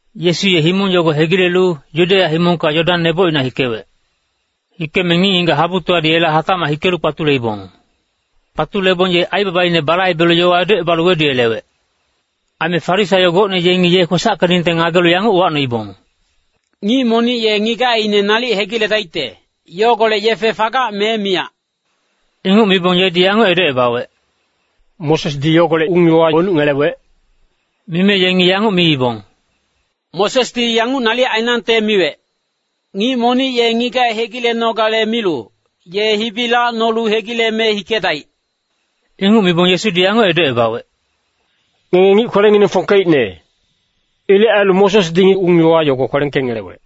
Yesu ye himong yogo hegilelu, Yudeya himongka Yodan misa nebocina hikewec. Hikeme ngic-ngigac habutowadi yela hatacmac hikelu kpatuleibong. Kpatulebong ye aibabaine balaibelu yowa edocebalu weduyelewec. Aime Farisaio gocne yengi ye kwesackeningte ngagelu yanguc uwacnoibong, “Ngic monic ye ngigacine nalic hegiledaicte, yogolec yefe fagac me miyac?” Inguc mibong yedi yanguc edocebawec, “Mosesdi yogolec ung-yowa wenuc ngelewec?” Mime yengi yanguc miibong, “Mosesdi yanguc nalic ainangte miwec, ‘Ngic monic ye ngigac hegilenogale milu, ye hibi lacnolu hegileme hikedaic.’” Inguc mibong Yesudi yanguc edocebawec, “Ngenge ngic kwelengineng fongkeicne. Ilec ailu Mosesdi ung-yowa yogo kwelengkengelewec.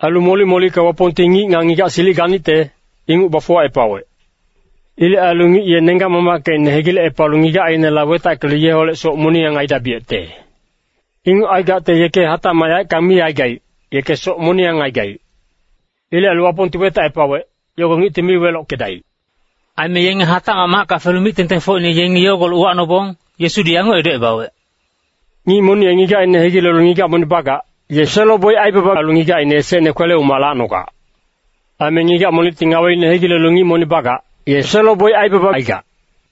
Ailu molic-molicka Wapongti ngic nga ngigac silic ganicte, inguc bafuwacepawec. ‘Ilec ailu ngic ye nenggac-mamackecine hegilecepalu ngigacineholec wetackelu yeholec soc moniyang aidabiyecte. Inguc aigacte yeke hatacmac yaeckang mi aigaic, yeke soc moniyang aigaic.’ Ilec ailu Wapongti wetacepawec, yogo ngicti mi welockedaic.” Aime yenge macka hatacmac felu mic-tengtengfocine yengi yogolec uwacnobong, Yesudi yanguc edocebawec, “Ngic monic ye ngigacine hegilelu ngigac monic bagac, ye selo-boic aibaba ailu ngigacine esecne kwele-umac lacnogac. Aime ngigac monicti ngaweine hegilelu ngic monic bagac, ye selo-boic aibaba aigac.”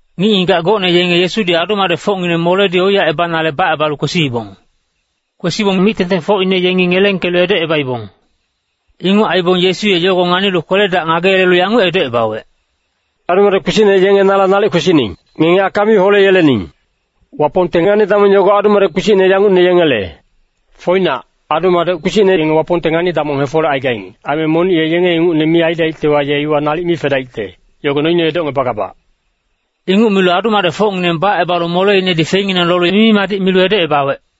Ngic-ngigac gocne yenge Yesudi adu-madecfocngineng moledi oiyacebanale yela bacebalu kwesiibong. Kwesibong mic-tengtengfocine yengi ngelengkelu edocebaibong. Inguc aibong Yesu ye yogo nganilu kwele-dac ngageyelelu yanguc edocebawec, “Adu-madec kpisicne yenge nala nalic kwesining, ngenge aka mi holeyelening. Wapongte ngani-damong yogo adu-madec kpisicne yangucne yengele. Foinac, adu-madec kpisicne yenge Wapongte ngani-damong hefolecaigaing. Aime monic ye yenge ingucne mi aidaictewa, ye iwa nalic mi fedaicte, yogo noine edocngebagabac.” Inguc milu adu-madecfocngineng bacebalu moleinedi feinginang lolu mimi-madic milu edocebawec.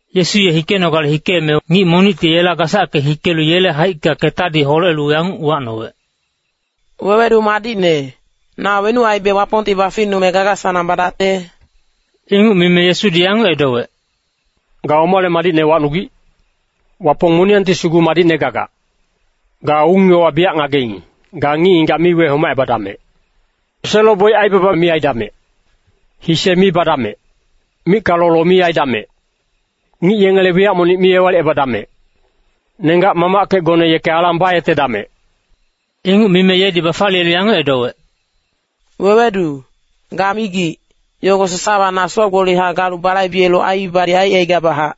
Yesu ye hikenogale hikeme, ngic monicti yela gasacke hikelu yele haicka ketadi holelu yanguc uwacnowec, “Wewedu madicne, na wenuc aibe Wapongti baficnume gaga-sanang badacte?” Inguc mime Yesudi yanguc edowec, “Ga omale madicne wacnugic? Wapong moniyangti sugu madicne gagac. Ga ung-yowa biyac ngageing, ‘Ga ngic-ngigac mi wehomacebadamec. Selo-boic aibaba mi aidamec. Hise mi badamec. Micka lolo mi aidamec. Ngic yengele wiyac monic mi ewalicebadamec. Nenggac-mamackecgone yeke alang bayetedamec.’” Inguc mime yedi bafaliyelu yanguc edowec, “Wewedu, ga migic, yogo sasawa na soc-gbolihac galu balaibelu aiibadi aicaigabachac.”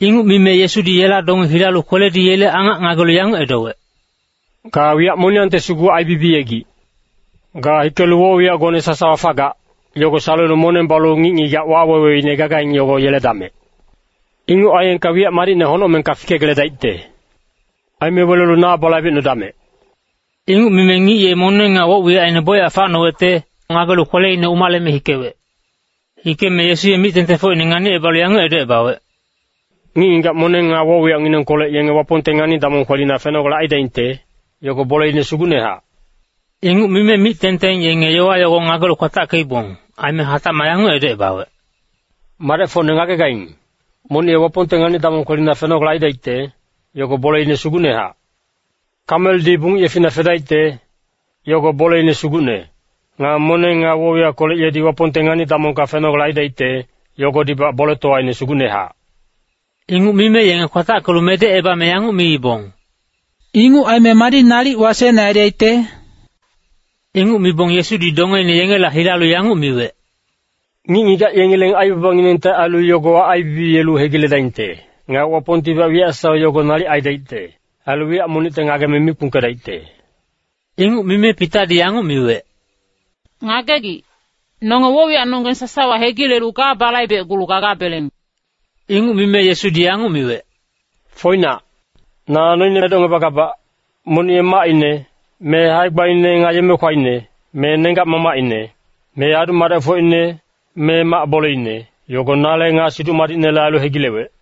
Inguc mime Yesudi yela donge hilalu kweledi yele angac ngagelu yanguc edowec, “Ga wiyac moniyangte sugu aibibiyegic. Ga hikelu woc-wiyacgone sasawa fagac, yogo salelu moneng balu ngic-ngigac waweweine gagaing, yogo yeledamec. Inguc aiyengka wiyac madicne honocmengka fikegeledaicte. Aime welelu na balaibecnudamec!” Inguc mime ngic ye moneng nga woc-wiyacine bocyac facnowecte, ngagelu kweleine umaleme hikewec. Hikeme Yesu ye mic-tengtengfocine nganicebalu yanguc edocebawec, “Ngic-ngigac moneng nga woc-wiyacnginengkolec yenge Wapongte ngani-damong kwelina fenogale aidaingte, yogo boleine sugucnehac.” Inguc mime mic-tengteng yenge yowa yogo ngagelu kwatackeibong. Aime hatacmac yanguc edocebawec, “Madecfocne ngagegaing, monic ye Wapongte ngani-damong kwelina fenogale aidaicte, yogo boleine sugucnehac. Kameldi bungic yefina fedaicte, yogo boleine sugucne. Nga moneng nga woc-wiyackolec yedi Wapongte ngani-damongka fenogale aidaicte, yogodibac boletowaine sugucnehac.” Inguc mime yenge kwatackelu medecebame yanguc miibong, “Inguc aime madi nalic wasecne aidaicte?” Inguc mibong Yesudi dongeine yengela hilalu yanguc miwec, “Ngic-ngigac yengileng aibabanginengte ailu yogowa aibibiyelu hegiledaingte. Nga Wapongtibac wiyac sasawa yogo nalic aidaicte. Ailu wiyac monicte ngageme mi kpungkedaicte.” Inguc mime Pitadi yanguc miwec, “Ngagegic, nonge woc-wiyacnonggeng sasawa hegilelu ga balaibecgulu gagabeleng.” Inguc mime Yesudi yanguc miwec, “Foinac, na noine edocngebagabac. Monic ye macine, me hae-gbaine nga yeme-kwaine, me nenggac-mamacine, me adu-madecfocine, me mac boleine, yogo nale nga Siduc Madicnele ailu hegilewec,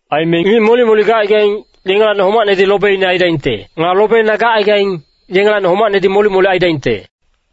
Aime ngic molic-molic gacaigaing, yengelacni homacnedi lobeine aidaingte. Nga lobeine gacaigaing, yengelacni homacnedi molic-molic aidaingte.”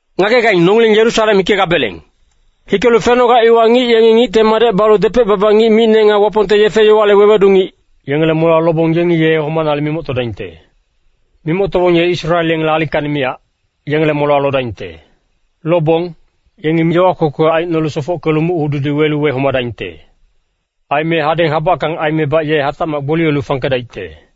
“Ngagegaing, nongileng Yerusalem hikegabeleng. Hikelu fenoga iwa ngic yengi Ngicte Madec balu depec-baba ngic micne, nga Wapongte yefe-yowale wewedu ngic, yengele molewa lobong, yengi ye homanale mimoctodaingte. Mimoctobong ye Israel yengele alingkacni miyac, yengele molewa lodaingte. Lobong, yengi yowa kwekwe aicnolu sofockelu muc-hududi welu wehomadaingte. Aime hadeng habackang aimebac ye hatacmac gboliyelu fangkedaicte.”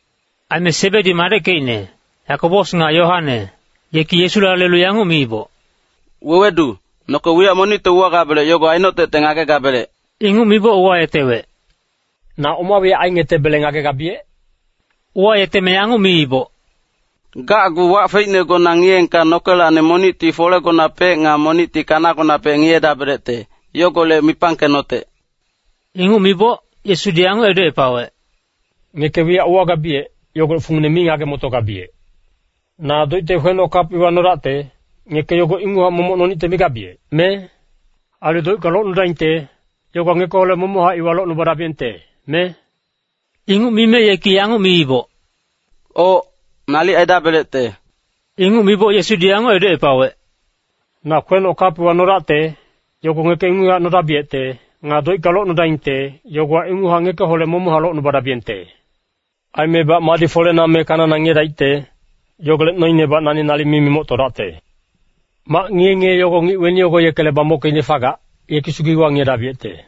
Aime Sebedi madeckecine, Yakobos nga Yoane, yeki Yesula lelu yanguc miiboc, “Wewedu, noke wiyac monicte uwagabelec yogo ainotecte ngagegabelec.” Inguc miboc uwayetewec, “Na oma wiyac aingetebele ngagegabiyec?” Uwayeteme yanguc miiboc, “Gacgu wac feicnegona ngiyeengka nokelacni monicti folegonapec nga monicti kanagonapec ngiyedabelecte, yogolec mipangkenotec.” Inguc miboc, Yesudi yanguc edocepawec, “Ngeke wiyac uwagabiyec, yogolec fungine mi ngage-motogabiyec. Na doicte kwenoc kap iwa nodacte, ngeke yogo inguchac momoc nonicte migabiyec, me? Ailu doicka locnudaingte, yogowa ngekeholec momochac iwa locnubadabiyengte, me?” Inguc mime yeki yanguc miiboc, “Oc, nalic aidabelecte.” Inguc miboc Yesudi yanguc edocepawec, “Na kwenoc kap iwa nodacte, yogo ngeke inguchac nodabiyecte. Nga doicka locnudaingte, yogowa inguchac ngekeholec momochac locnubadabiyengte. Aimebac madi folena me kanana ngiyedaicte, yogolec noinebac nani nalic mi mimoctodacte. Mac ngiye-ngiye yogo ngic weni yogo yekele bamockeicne fagac, yeki sugu iwa ngiyedabiyecte.”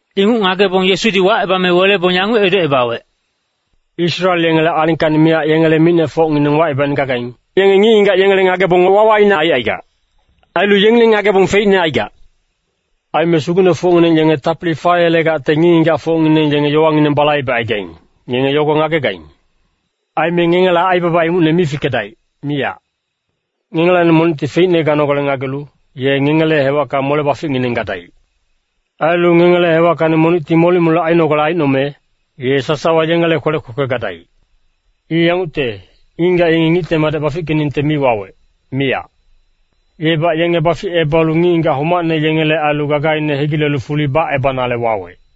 Inguc ngagebong Yesudi wacebame welebong yanguc edocebawec, “Israel yengele alingkacni miyac yengele micnefocngineng wacebaicne gagaing, yenge ngic-ngigac yengele ngagebong wawaine aicaigac. Ailu yengileng ngagebong feicne aigac. Aime sugucnefocngineng yenge tapili fayelegacte ngic-ngigacfocngineng yenge yowangineng balaibecaigaing, ngenge yogo ngagegaing. Aime ngengela aibaba ingucne mi fikedaic, miyac. Ngengelacni monicti feicne ganogale ngagelu, ye ngengele hewacka mole-baficngineng gadaic. Ailu ngengele hewackacni monicti molic-molic ainogale aicnome, ye sasawa yengele kwelec kwekwe gadaic. I yangucte, ngic-ngigac yengi Ngicte Madec bafickeningte mi wawec, miyac. Yebac yenge baficebalu ngic-ngigac homacne yengele ailu gagaine hegilelu fuli bacebanale wawec.”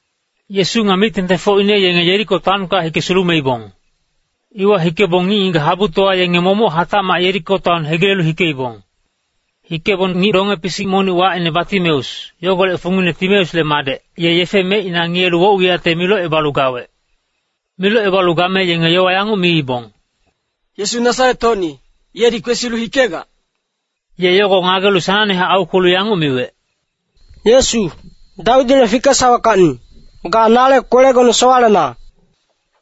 Yesu nga mic-tengtengfocine yenge Yeriko taonka hike sulumeibong. Iwa hikebong ngic-ngigac habutowa yenge momoc hatacmac Yeriko taon hegilelu hikeibong. Hikebong ngic donge-pisic monic wacine Batimeus, yogolec fungine Timeusle madec, ye yefe mecina ngiyelu woc-wiyacte milocebalu gawec. Milocebalu game yengi yowa yanguc miibong, “Yesu Nasaret-hocni, yedi kwesilu hikegac.” Ye yogo ngagelu sanangnehac aukwelu yanguc miwec, “Yesu, Dawidile fikesaweckacni, ga nale kwelegone sowalena.”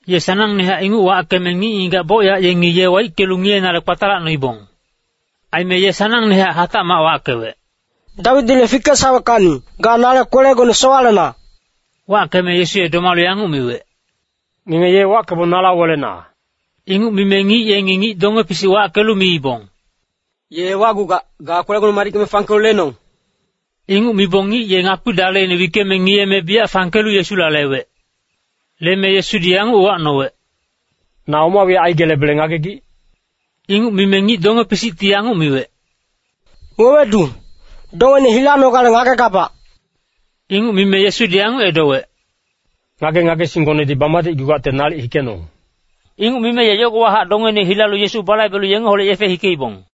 Ye sanangnehac inguc wackeme ngic-ngigac bocyac yengi ye waickelu ngiyenale kpatalacnoibong. Aime ye sanangnehac hatacmac wackewec, “Dawidile fikesaweckacni, ga nale kwelegone sowalena.” Wackeme Yesu ye domalu yanguc miwec, “Ngenge ye wackebong nala welena.” Inguc mime ngic yengi ngic donge-pisic wackelu miibong, “Ye wacgugac, ga kwelegone madickeme fangkelu lenong.” Inguc mibong ngic ye ngakpi daleine wickeme ngiyeme biyac fangkelu Yesula lewec. Leme Yesudi yanguc uwacnowec, “Na oma wiyac aigelebele ngagegic?” Inguc mime ngic donge-pisicti yanguc miwec, “Wewedu, dongene hilanogale ngagegabac.” Inguc mime Yesudi yanguc edowec, “Ngage-ngagesinggonedi bamadicgugacte nalic hikenong!” Inguc mime ye yogowahac dongeine hilalu Yesu balaibelu yengeholec yefe hikeibong.